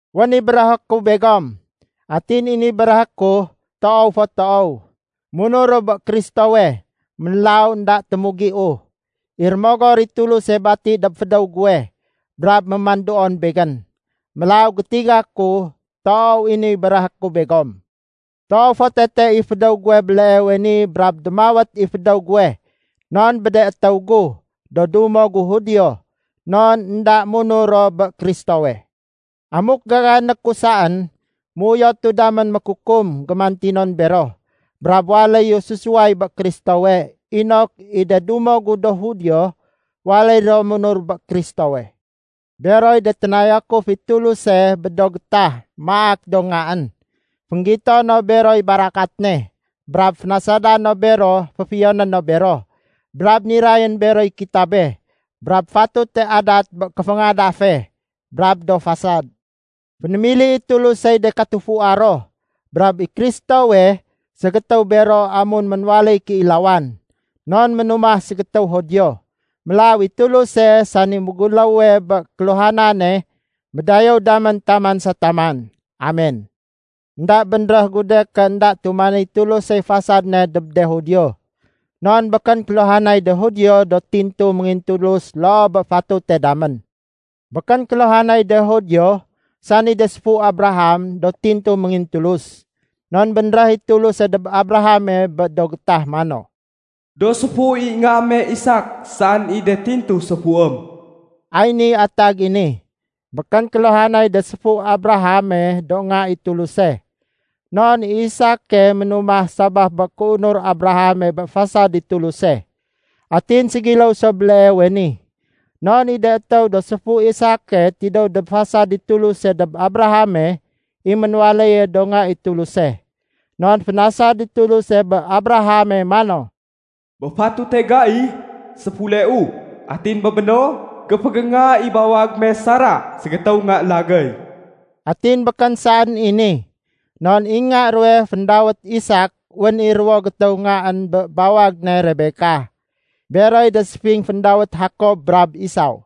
Wén i béréhé ku begom. Atin i ni béréhé ku, toow fo toow. Munuru bé Kristowe, mélaw énda témugiu. I Rémogor i Tuluse bati dob fédéw guwe brab mémanduon begén. Mélaw gétiga ku, toow i ni béréhé ku begom. Toow fo tete i fédéw guwe béleewe ni brab démawét i fédéw guwe non bé de étéw gu, do dumo gu Judio, non énda munur ro bé Kristowe. Amuk gagané ku saén, méuyotu damén mékukum gémantinon bero, brab waléyu sésuway bé Kristowe, inok i de dumo gu do Judio waléy ro munur bé Kristowe. Beroy de ténayakuf i Tuluse bé do gétah maak do ngaén. Fénggito no beroy barakat ne, brab fénasada no bero féfiyoné no bero. Brab nirayén beroy kitabe, brab fatute adat bé kéféngadafe, brab do fasad. Fénémili i Tulusey de katufua ro. Brab i Kristowe, ségétéw bero amun ménwaléy kéilawan, non ménumah ségétéw Judio. Mélaw i Tuluse, sani méguléwe bé kéluhanane, médayéw dam taman sa taman! Amen! Enda bénréh gu de ké énda tumanéy Tulusey fasad ne dob de Judio. Non békén kéluhanay de Judio do tintu méngintulus loo bé fatute damén. Békén kéluhanay de Judio, sani de séfu Abraham, do tintu méngintulus. Non bénréh i Tuluse dob Abrahame bé do gétah mano, “Do séfu i nga me Isak saén i de tintu séfuém.” Ay niy atag i ni, békén kéluhanay de séfu Abraham do nga i Tuluse. Non i Isake ménumah sabaf bé kéunur Abraham bé fasad i Tuluse. Atin ségiléw so béleewe ni. Non i de étéw do séfu Isake tidéw dob fasad i Tuluse dob Abrahame, i ménwaléye do nga i Tuluse. Non fénasad i Tuluse bé Abrahame mano, “Bé fatute gai, séfuleu. Atin bé béno, géfégénga i bawag me Sarah ségétéw nga lagéy.” Atin békén saén i ni. Non i nga ruwe féndawét Isak wén i ruwo gétéw ngaén bé bawag ne Rebekah. Beroy de séfing féndawét Jakob brab Esaw.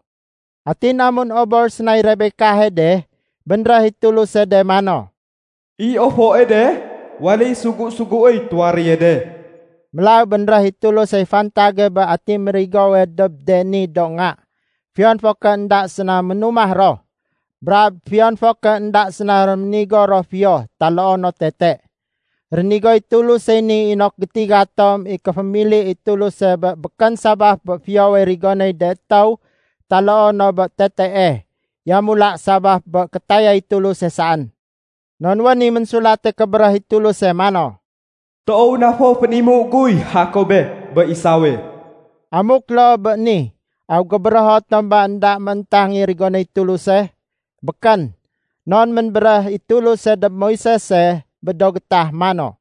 Atin amun obor sénay Rebekahe de, bénréh i Tuluse de mano, “I ofoe de waléy sugu-suguéy tuwaréye de.” Mélaw bénréh i Tulusey fantage bé ati mérigowe dob de ni do nga, fiyon fo ké énda séna ménumah ro, brab fiyon fo ké énda séna réménigo ro fiyo taloo no tete. Rénigoy Tulusey ni inok gétiga tom i kéfémili i Tuluse bé békén sabaf bé fiyowe rigonéy de étéw taloo no bé tetee, yamula sabaf bé kétayay Tuluse saén. Non wén i Ménsulate Kébéréh i Tuluse mano, “Toow na fo fénimu guy Jakobe bé Esawe.” Amuk loo bé ni, aw gébérého tom ba énda mééntang i rigonéy Tuluse? Békén! Non ménbéréh i Tuluse dob Moisese bé do gétah mano,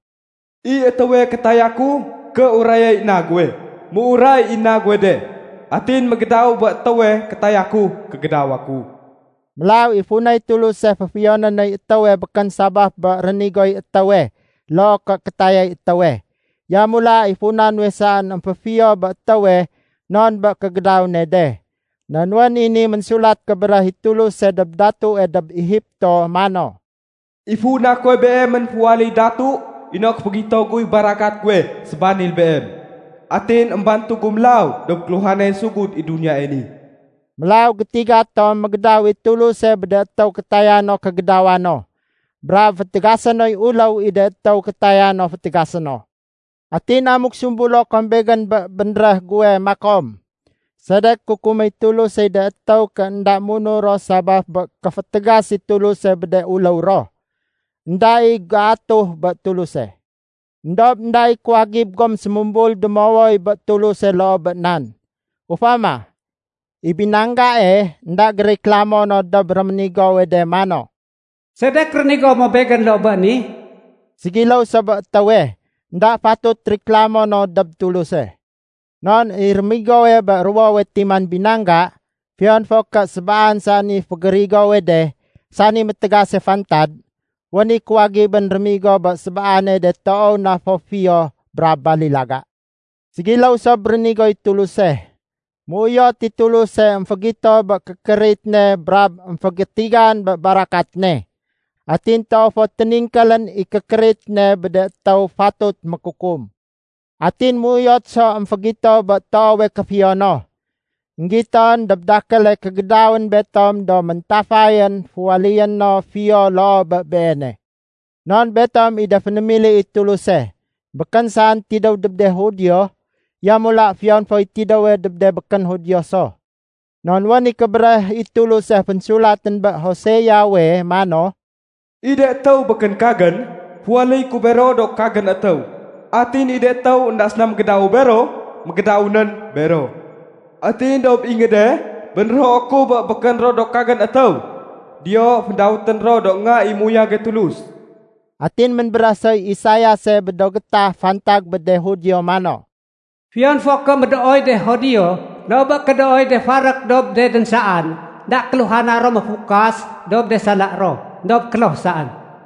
“I étéwe kétaya ku kéurayay na guwe, méuray i na guwe de. Atin mégédawu bé étéwe kétaya ku kégédawa ku.” Mélaw i funay Tuluse féfiyoné noy étéwe békén sabaf bé rénigoy étéwe loo ké kétayay étéwe. Yamula i funa nuwe saén émféfiyo bé étéwe non bé kégédaw ne de. Non wén i ni Ménsulat Kébéréh i Tuluse dob datue dob Egipto mano, “I funa kuwe beem ménféwaléy datu inok fégito guy barakat guwe sébanil beem, atin émbantugu mélaw dob kéluhanay sugud i duniyae ni.” Mélaw gétiga tom mégédaw i Tuluse bé de étéw kétaya no kégédawa no. Brab fétégasé noy uléw i de étéw kétaya no fétégasé no. Atin amuk sumbulo kom begén bé bénréh guwe makom, “Sedek kukuméy Tulusey de étéw ké énda munur ro sabaf bé kéfétégas i Tuluse bé de uléw ro? Enda i géatuh bé Tuluse.” Endob énda i kuwagib gom sémumbul démowoy bé Tuluse loo bé nan. Ufama, i binanggae énda gériklamo no dob réménigowe de mano, “Sedek rénigo mo begén loo bé ni?” Ségiléw so bé étéwe, énda fatut riklamo no dob Tuluse. Non i rémigowe bé ruwowe timan binangga, fiyon fo ké sébaan saén i fégérigowe de, sani métégase fantad, wén i kuwagibén rémigo bé sébaane de toow na fo fiyo brab balilaga. Ségiléw so bé rénigoy Tuluse. Méuyot i Tuluse émfégito bé kékérit ne brab émfégétigan bé barakat ne. Atin toow fo téningkélén i kékérit ne bé de étéw fatut mékukum. Atin méuyot so émfégito bé toowe kéfiyo no, énggiton dob dakéle kégédawén betom do méntafayén féwaléyé no fiyo loo bé Beene. Non betom i de fénémili i Tuluse, békén saén tidéw dob de Judio, yamula fiyon foy tidéwe dob de békén Judio so. Non wén i Kébéréh i Tuluse fénsulatén bé Hoseawe mano, “I de étéw békén kagén, féwaléyé ku bero do kagén étéw. Atin i de étéw énda séna mégédawu bero, mégédawunén bero. Atin dob ingéde bénrého ku bé békén ro do kagén étéw, diyo fédawétén ro do nga i méuyage Tulus.” Atin ménbéréh soy Isaiase bé do gétah fantag bé de Judio mano, “Fiyon fo ké médooy de Judio loo bé kédooy de farék dob de dénsaan énda kéluhana ro méfukas dob de sala ro, éndob kloh saén.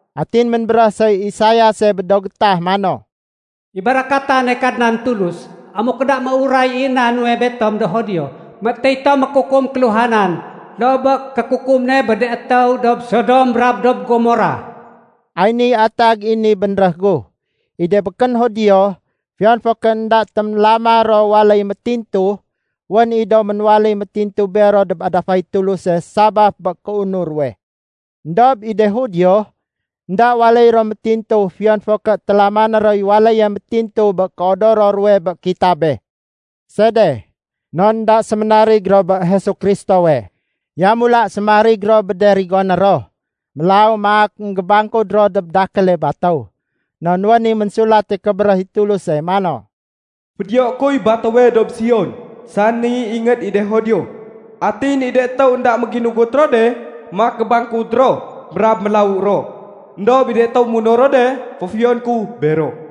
Atin ménbéréh soy Isaiase bé do gétah mano, “I barakatane Kadnan Tulus, amuk énda méuray i na nuwe betom do Judio, météy tom mékukum kéluhanan loo bé kékukum ne bé de étéw dob Sodom brab dob Gomora.” Ay niy atag i ni bénréh gu. I de békén Judio, fiyon fo ké énda téménlama ro waléy métintu, wén i do ménwaléy métintu bero dob adafay Tuluse sabaf bé kéunur ruwe. Endob i de Judio, énda waléy ro métintu fiyon fo ké télamané roy waléye métintu bé kéodoro ruwe bé kitabe. Sede? Non énda séménarig ro bé Jesu Kristowe. Yamula séménarig ro bé de rigoné ro. Mélaw maak énggébangkud ro dob dakéle batéw. Non wén i Ménsulate Kébéréh i Tuluse mano, “Fédiyoé kuy batéwe dob Sion, sani ingéd i de Judio. Atin i de étéw énda méginugut ro de, maak gébangkud ro brab mélawu ro. Endob i de étéw munur ro de, féfiyoné ku bero.”